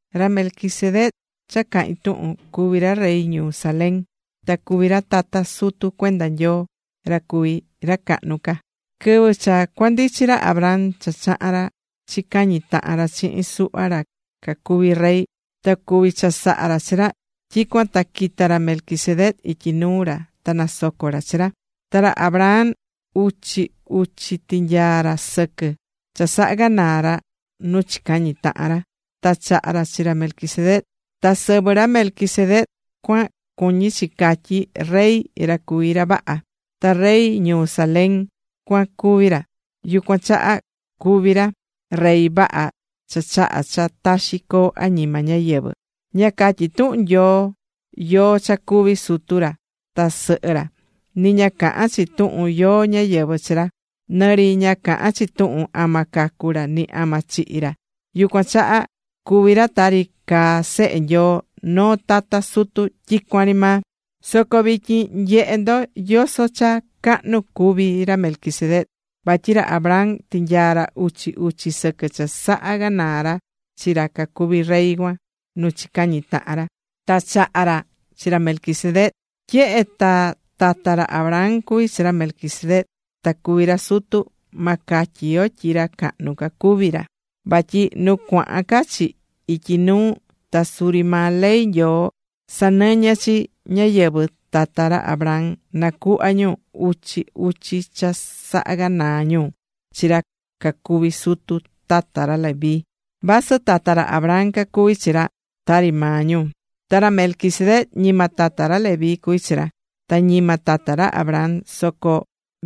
Ra Melquisedec cha cahín tuhun, cuvi̱ ra rey ñuu Salém, ta cuví ra tata sutu cuenda Nyoo, ra cuví ra cahnu ca. Quɨvɨ cha cuandichi ra Abraham cha chaha̱n ra chicañi tahan ra chihin suhva ra cacuvi̱ rey, ta cuvi̱ chasaha ra chi ra, tyicuan ta quita̱ ra Melquisedec ityi nuu ra ta nasoco̱ ra chi ra. Ta ra Abraham uchi uchi tinyaa̱ ra sɨquɨ́ cha saha̱ ganaa ra nu chicañi̱ tahan ra, ta chaha̱ ra chi ra Melquisedec. Ta sɨvɨ ra Melquisedec cuan cuñí chi catyí: “Rey, ra cuví ra vaha.” Ta rey ñuu Salem cuan cuví ra, yucuan chaha cuví ra: “Rey vaha cha chahá cha taxi coo añima ñáyɨvɨ.” Ña catyí tuhun Nyoo yóó cha cuvi̱ sutu ra ta sɨhɨ ra, ni ña cahán chi tuhun yóó ñáyɨvɨ chi ra. Nɨ ri ña cahán chi tuhun ama cacu̱ ra, ni ama chihi̱ ra. Yucuan chaha cuví ra tari caá Sehe Nyoo, noo tata sutu tyicuan ri maa. Soco, vityin nye̱he ndo yoso cha cahnu cuví ra Melquisedec, vatyi ra Abraham tinyaa̱ ra uchi uchi sɨquɨ cha saha ganaa̱ ra chi ra cacuvi̱ rey cuan nu chicañi̱ tahan ra, ta chaha̱ ra chi ra Melquisedec. Tyehe ta tata ra Abraham cuví ra Melquisedec, ta cuví ra sutu, ma catyi yo tyi ra cahnu ca cuví ra. Vatyi nu cuahan ca chi ityi nuu ta suri maa ley Nyoo sanɨñɨ chi ñáyɨvɨ tata ra Abraham nacuhva ñu uchi uchi cha saha̱ ganaa ñu chi ra cacuví sutu tata ra Leví, vasɨ tata ra Abraham cacuví chi ra tari maa ñu. Ta ra Melquisedec, ñima tata ra Leví cuví chi ra, ta ni ñima tata ra Abraham, soco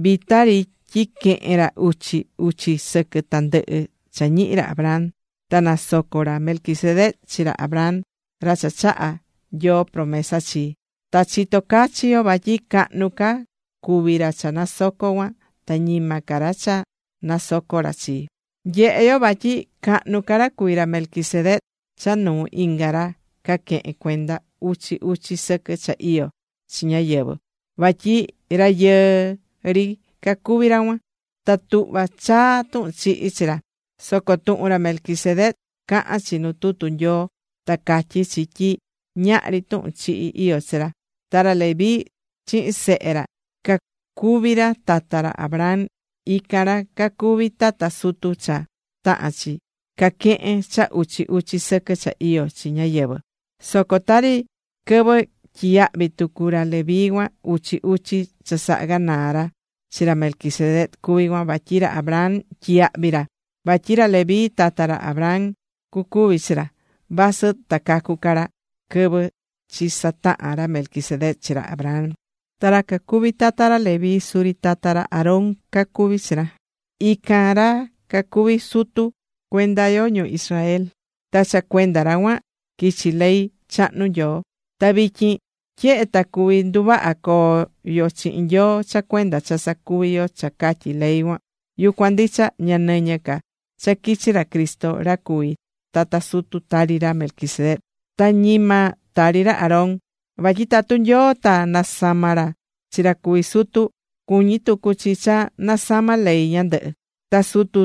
vita ri tyi quehe̱n ra uchi uchi sɨquɨ tandɨhɨ cha ñihi̱ ra Abraham. Ta nasoco̱ ra Melquisedec chi ra Abraham, ra cha chaha̱ Nyoo promesa chii. Ta chitó cachi yo vatyi cahnu ca cuví ra cha nasocó cuan, ta ñima ca ra cha nasoco̱ ra chi. Nyehé yo vatyi cahnu ca ra cuví ra Melquisedec cha nuu inga ra caquehén cuenda uchi uchi sɨquɨ cha iyó chi ñáyɨvɨ, vatyi rayɨɨ ri cacuví ra cuan, ta tuhva chaa tuhun chihi chi ra. Soco tuhun ra Melquisedec cahán chi nu tutu Nyoo ta catyí chi tyi ñahri tuhun chihi iyó chi ra. Ta ra Leví, chihin sehe ra, ra cacuví tata ra Abraham, ican ra cacuví tata sutu cha tahán chi caquehén cha uchi uchi sɨquɨ cha iyó chi ñáyɨvɨ. Soco tari quɨvɨ tyiyahvi̱ tucu ra Leví cuan uchi uchi cha saha ganaa ra chi ra Melquisedec cuví cuan, vatyi ra Abraham tyiyahvi̱ ra. Vatyi ra Leví, tata ra Abraham cucuvi chi ra, vasɨ ta cacu ca ra quɨvɨ chisataha̱n ra Melquisedec chi ra Abraham. Ta ra cacuví tata ra Leví suri tata ra Aarón cacuví chi ra, ican ra cacuví sutu cuenda yo ñu Israel, ta cha cuenda ra cuan quichi̱ ley chahnu Nyoo. Ta vityin tyehe ta cuví nduvaha coo yo chihin Nyoo cha cuenda cha sacuví yo cha catyí ley cuan, yucuan ndicha ña nɨñɨ ca cha quichi̱ ra Cristo ra cuví tata sutu tari ra Melquisedec, ta ñima tari ra Aarón. Vatyi tatu Nyoo ta nasama̱ ra chi ra cuví sutu, cuñi̱ tucu chi cha nasama̱ ley ñandɨhɨ. Ta Sutu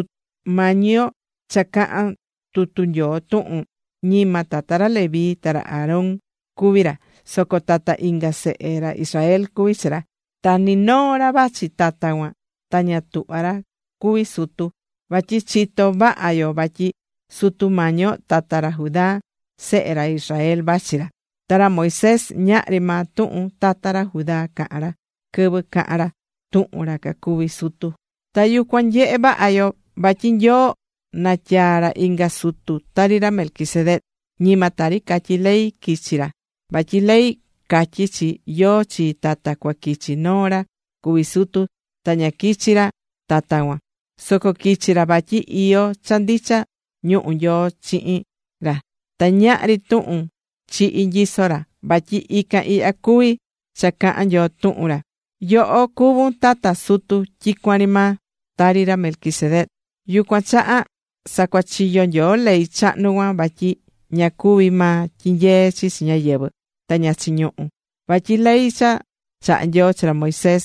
Mañi yo cha cahán tutu Nyoo tuhun, ñima tata ra Leví ta ra Aarón cuví ra, soco tata inga sehe ra Israel cuví chi ra. Ta ni noo ra vachi tata cuan ta ña tuhvá ra cuví sutu. Vatyi chitó vaha yo vatyi Sutu Mañi yo tata ra Judá, sehe ra Israel vachi ra, ta ra Moisés ñahri maa tuhun tata ra Judá caha̱n ra quɨvɨ caha̱n ra tuhun ra cacuví sutu. Ta yucuan nyehé vaha yo, vatyi Nyoo natyaa̱ ra inga sutu tari ra Melquisedec. Ñima tari catyí ley quichi̱ ra, vatyi ley catyí chi yóó chi tata cua quichi noo ra cuví sutu, ta ña quichi̱ ra tata cuan, soco quichi̱ ra vatyi iyó cha ndicha ñuhu Nyoo chihin ra ta ñahri tuhun chihí nyisó ra. Vatyi ican ihya cuví cha cahán Nyoo tuhun ra: Yoho cuvún tata sutu tyicuan ri maa, Tari ra Melquisedec. Yucuan chaha sacuachiyo̱ Nyoo ley chahnu cuan vatyi ña cuví maa tyinyee chi chi ñáyɨvɨ, ta ña chiñuhú. Vatyi ley cha chaha̱ Nyoo chi ra Moisés,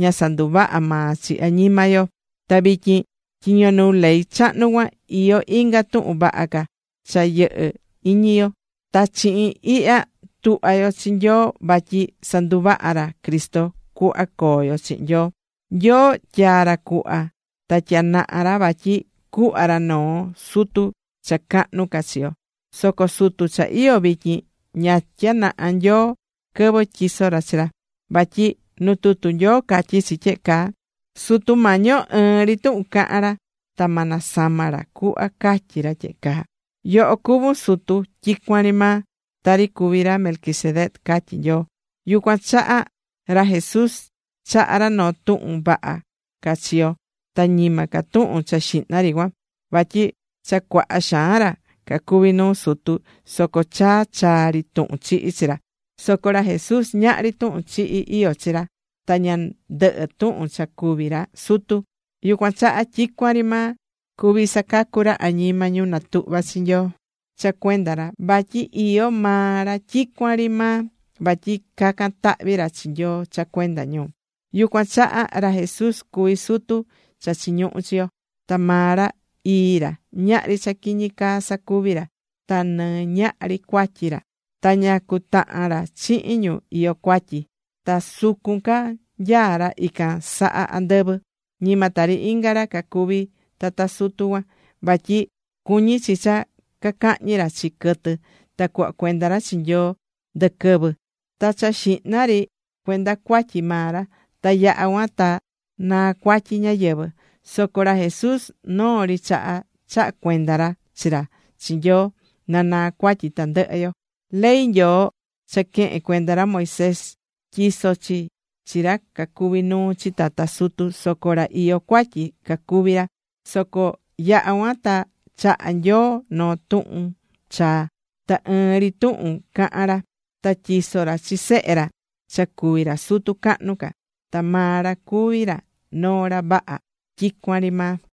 ña sanduvaha̱ maa chi añima yo. Ta vityin, tyiño nuu ley chahnu cuan, iyó inga tuhun vaha ca cha yɨhɨ iñi yo. Ta chihin ihya tuhvá yo chi Nyoo vatyi sanduvaha̱ ra Cristo cuhva coo yo chihin Nyoo. Nyoo tyaa̱ ra cuhva ta tyanaha̱ ra vatyi cuhva ra noo sutu cha cahnu ca chi yo. Soco sutu cha iyó vityin ña tyanaha̱ Nyoo quɨvɨ tyiso̱ ra chi ra. Vatyi nu tutu Nyoo catyí chi tyehe caa: Sutu Mañi yo, ɨɨn ri tuhun cahan ra, ta ma nasama ra cuhva catyí ra tyehe caa: “Yoho cuvún Sutu tyicuan ri maa, tari cuví ra Melquisedec”, catyí Nyoo. Yucuan chaha ra Jesús chaha̱ ra noo tuhun vaha ca chi yo, ta ñima ca tuhun cha xihna ri cuan. Vatyi cha cuaha xaan ra cacuvi̱ sutu, soco chaa chaa ri tuhun chihí chi ra. Soco ra Jesús ñahri tuhun chihi iyó chi ra, ta ña ndɨhɨ tuhun cha cuví ra sutu. Yucuan chaha tyicuan ri maa cuví sacacu ra añima ñu natuhvá chi Nyoo cha cuenda ra, vatyi iyó maa ra tyicuan ri maa, vatyi cacan tahvi ra chi Nyoo cha cuenda ñu. Yucuan chaha ra Jesús cuví sutu cha chiñuhú chi yo. Ta maa ra, ii ra, ñahri cha quiñi caa sacuví ra, ta ni ñahri cuatyi ra. Ta ña cutahán ra chihin ñu iyó cuatyi. Ta sucun ca nyaá ra, ican saha andɨvɨ. Ñima tari inga ra cacuví tata sutu cuan, vatyi cuñi̱ chi cha cacahñi ra chi quɨtɨ ta cuhva cuenda ra chi Nyoo ndɨ quɨvɨ. Ta cha xihna ri, na naa cuatyi maa ra, ta yaha cuan ta naa cuatyi ñáyɨvɨ. Soco ra Jesús noo ri chaha, chaha̱ cuenda ra chi ra chi Nyoo na naa cuatyi tandɨhɨ yo. Ley Nyoo cha quehe̱n cuenda ra Moisés, tyisó chi chi ra cacuví nuu chi tata sutu, soco ra iyó cuatyi cacuví ra. Soco yaha̱ cuan ta chaha̱ Nyoo noo tuhun chaa, ta ɨɨn ri tuhun cahan ra. Ta tyiso̱ ra chi Sehe ra cha cuví ra Sutu cahnu ca, ta maa ra cuví ra noo ra vaha tyicuan ri maa.